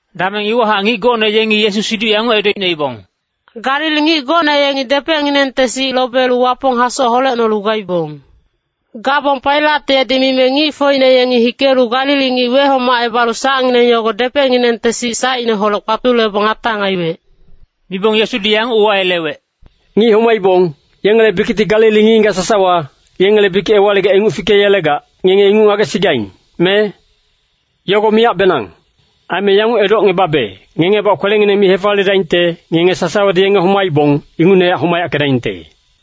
Dameng iwahac ngic gocne yengi Yesu siduc yanguc edocnoibong, “Galili ngic gocne yengi depecnginengte sic lobelu Wapong hasoc holecnolu gaibong. Gabong Pailat yedi mime ngicfocine yengi hikelu Galili ngic wehomacebalu sacngineng yogo depecnginengte sic sacineholec kpatulebong atang aiwec.” Mibong Yesudi yanguc uwayelewec, “Ngic homaibong, yengele bikicti Galili ngic-ngigac sasawa, yengele bikic ewaligac inguc fikeyelegac, ngenge inguc ngagesigaing, me? Yogo miyacbenang! Aime yanguc edocngebabe, ngengebac kwelengineng mi hefaliyedaingte, ngenge sasawadi yenge homaibong, ingucnehac homayackedaingte.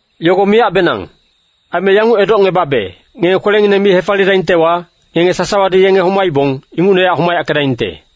Yogo miyacbenang! Aime yanguc edocngebabe, ngenge kwelengineng mi hefaliyedaingtewa, ngenge sasawadi yenge homaibong, ingucnehac homayackedaingte.”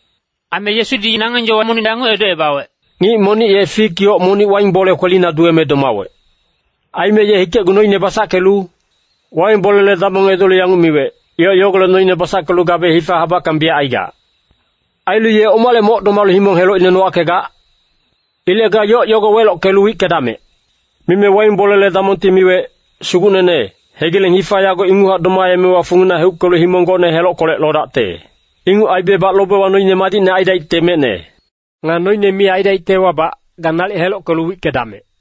Aime Yesudi nangeng yowa monic yanguc edocebawec, “Ngic monic ye fik yoc monic waing bole kwelina duweme domawec. Aime ye hikecgu noine basackelu waing bolele damong edolu yanguc miwec, ‘Yoc yogolec noine basackelu gabe hifa habackang biyac aigac. Ailu ye omale moc domalu himong helocine nowackegac? Ilec ga yoc yogo welockelu wickedamec!’ “Mime waing bolele damongti miwec, ‘Sugucnene, hegileng hifa yago inguchac domaemewa fungina heuckelu himong gocne helockolec lodacte. Inguc aibebac lobewa noine madicne aidaicte mecne. Nga noine mi aidaictewabac, ga nalic helockelu wickedamec!’”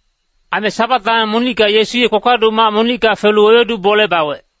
Aime Sabat dameng monicka Yesu ye kpakpaduc mac monicka felu wewedu bole bawec.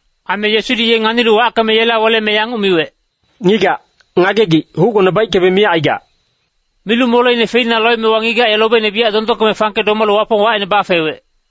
Aime Yesudi ye nganilu wackeme yela weleme yanguc miwec, “Ngigac, ngagegic, hucgone baickebe miyac aigac.” Milu moleine feina loemewa ngigac ye lobeine biyac dondongkeme fangke domalu Wapong wacine bafewec.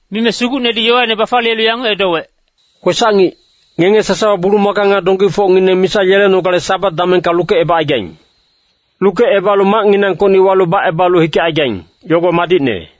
Mime Sugucnedi yowaine bafaliyelu yanguc edowec, “Kwesac-ngic, ngenge sasawa bulumaka nga donggifocngineng misa yelenogale Sabat damengka lukecebacaigaing. Lukecebalu macnginangkocni walu bacebalu hikecaigaing, yogo madicne.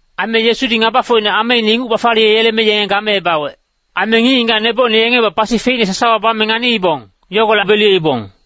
Aime Yesudi ngabafocine ameine inguc bafaliyeyeleme yenge gameebawec. Aime ngic-ngigac nebocine yengebac pasi feicne sasawa bame nganiibong, yogolec beliyeibong.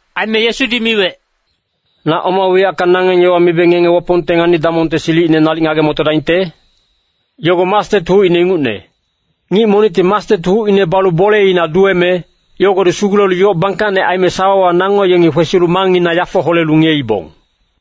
Aime Yesudi miwec, “Na oma wiyacka nangeng yowa mibe ngenge Wapongte ngani-damongte silicine nalic ngage-motodaingte? Yogo mastet hucine ingucne. Ngic monicti mastet hucine balu boleina duweme, yogodi sugulelu yoc bangkacne aime sawawa nango yengi kwesilu mangngina yafo holelu ngiyeibong.”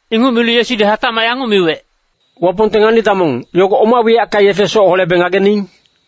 Inguc milu Yesudi hatacmac yanguc miwec, “Wapongte ngani-damong, yogo oma wiyacka yefe soc holebe ngagening?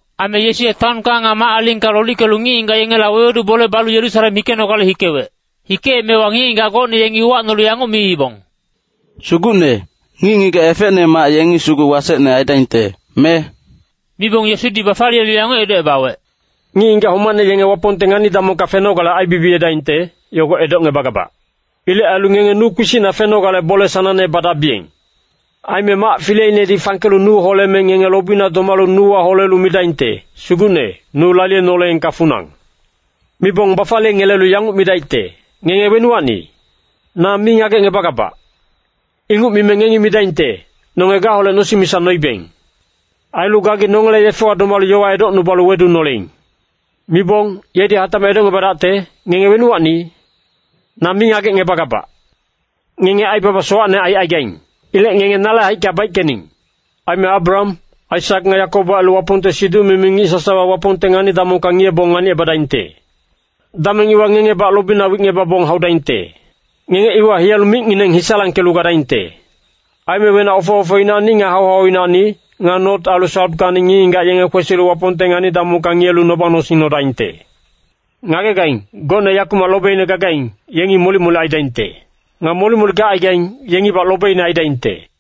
Aime Yesu ye taonka nga mac-alingka lolickelu ngic-ngigac yengela wewedu bole balu Yerusalem hikenogale hikewec. Hikeemewa ngic-ngigac gocne yengi uwacnolu yanguc miibong, “Sugucne, ngic-ngigac efecnemac yengi sugu wasecne aidaingte, me?” Mibong Yesudi bafaliyelu yanguc edocebawec, “Ngic-ngigac homacne yenge Wapongte ngani-damongka fenogale aibibiyedaingte, yogo edocngebagabac. Ilec ailu ngenge nu kpisicna fenogale bole sanangne badabiyeng! Aime mac fileinedi fangkelu nu holeme ngenge lobina domalu nuwa holelu midaingte, ‘Sugucne, nu laliyenoleengka funang!’ “Mibong bafaliyengelelu yanguc midaicte, ‘Ngenge wenuwacni? Na mi ngagecngebagabac!’ “Inguc mime ngengi midaingte, ‘Nonge gaholec nosing misa noibeng. Ailu gagi nongele yefewa domalu yowa edocnubalu wedunoleing.’ “Mibong, yedi hatacmac edocngebadaicte, ‘Ngenge wenuwacni? Na mi ngagecngebagabac! Ngenge aibaba sowacne aicaigaing. Ilec ngenge nale haicka baickening!’ “Aime Abraham, Aisak nga Yakobo ailu Wapongte siduc-mimi ngic sasawa Wapongte ngani-damongka ngiyebong nganicebadaingte. Dameng iwa ngengebac lobina wicngebabong haudaingte. Ngenge iwa hiyalu micngineng hisalangkelu gadaingte. Aime wenac ofe-ofeinacni nga hau-hauinacni, nga not ailu sautkacni ngic-ngigac yenge kwesilu Wapongte ngani-damongka ngiyelu noba-nosing nodaingte. Ngagegaing, gocne yakumac lobeine gacaigaing, yengi molic-molic aidaingte. Nga molic-molic gacaigaing, yengibac lobeine aidaingte.”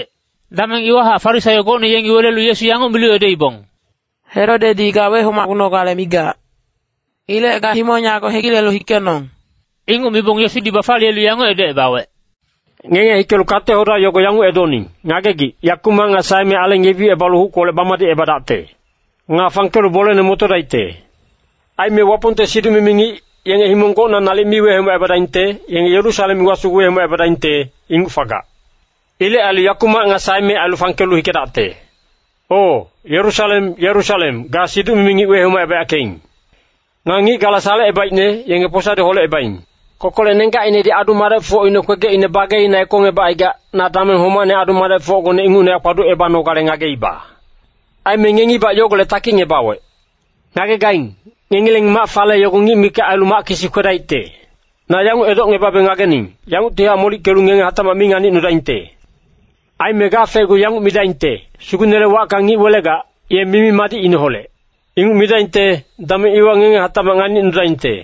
Dameng iwahac Farisaio gocne yengi welelu Yesu yanguc milu edoibong, “Herodedi ga wehomacgunogale migac. Ilec ga himong yago hegilelu hikenong!” Inguc mibong Yesudi bafaliyelu yanguc edocebawec, “Ngenge hikelu kate-hoda yogo yanguc edoning, ‘Ngagegic, yakumac nga saeme aleng yebicebalu huckolec bamadicebadacte. Nga fangkelu bolene motodaicte.’ Aime Wapongte siduc-mimi ngic, yenge himong gocna nalic mi wehomacebadaingte, yenge Yerusalem iwa sugu wehomacebadaingte, inguc fagac. Ilec ailu yakumac nga saeme ailu fangkelu hikedacte. “O, Yerusalem, Yerusalem, ga siduc-mimi ngic wehomacebayackeing. Nga ngic gala salecebaicne, yenge posadi holecebaing. Kokolec nenggacinedi adu-madecfocine kwegecine bageina ekongebacaigac, na dameng homacne adu-madecfocgone ingucnehac kpaducebanogale ngageiba. Aime ngengibac yogolec takicngebawec. Ngagegaing, ngengileng mac fale yogo ngic mikac ailu mac kisi kwedaicte. Na yanguc edocngebabe ngagening, yanguctihac molickelu ngenge hatacmac mi nganicnudaingte. Aime gafecgu yanguc midaingte, ‘Sugucnele wacka ngic welegac, ye mimi-madicineholec.’ Inguc midaingte, dameng iwa ngenge hatacmac nganicnudaingte.”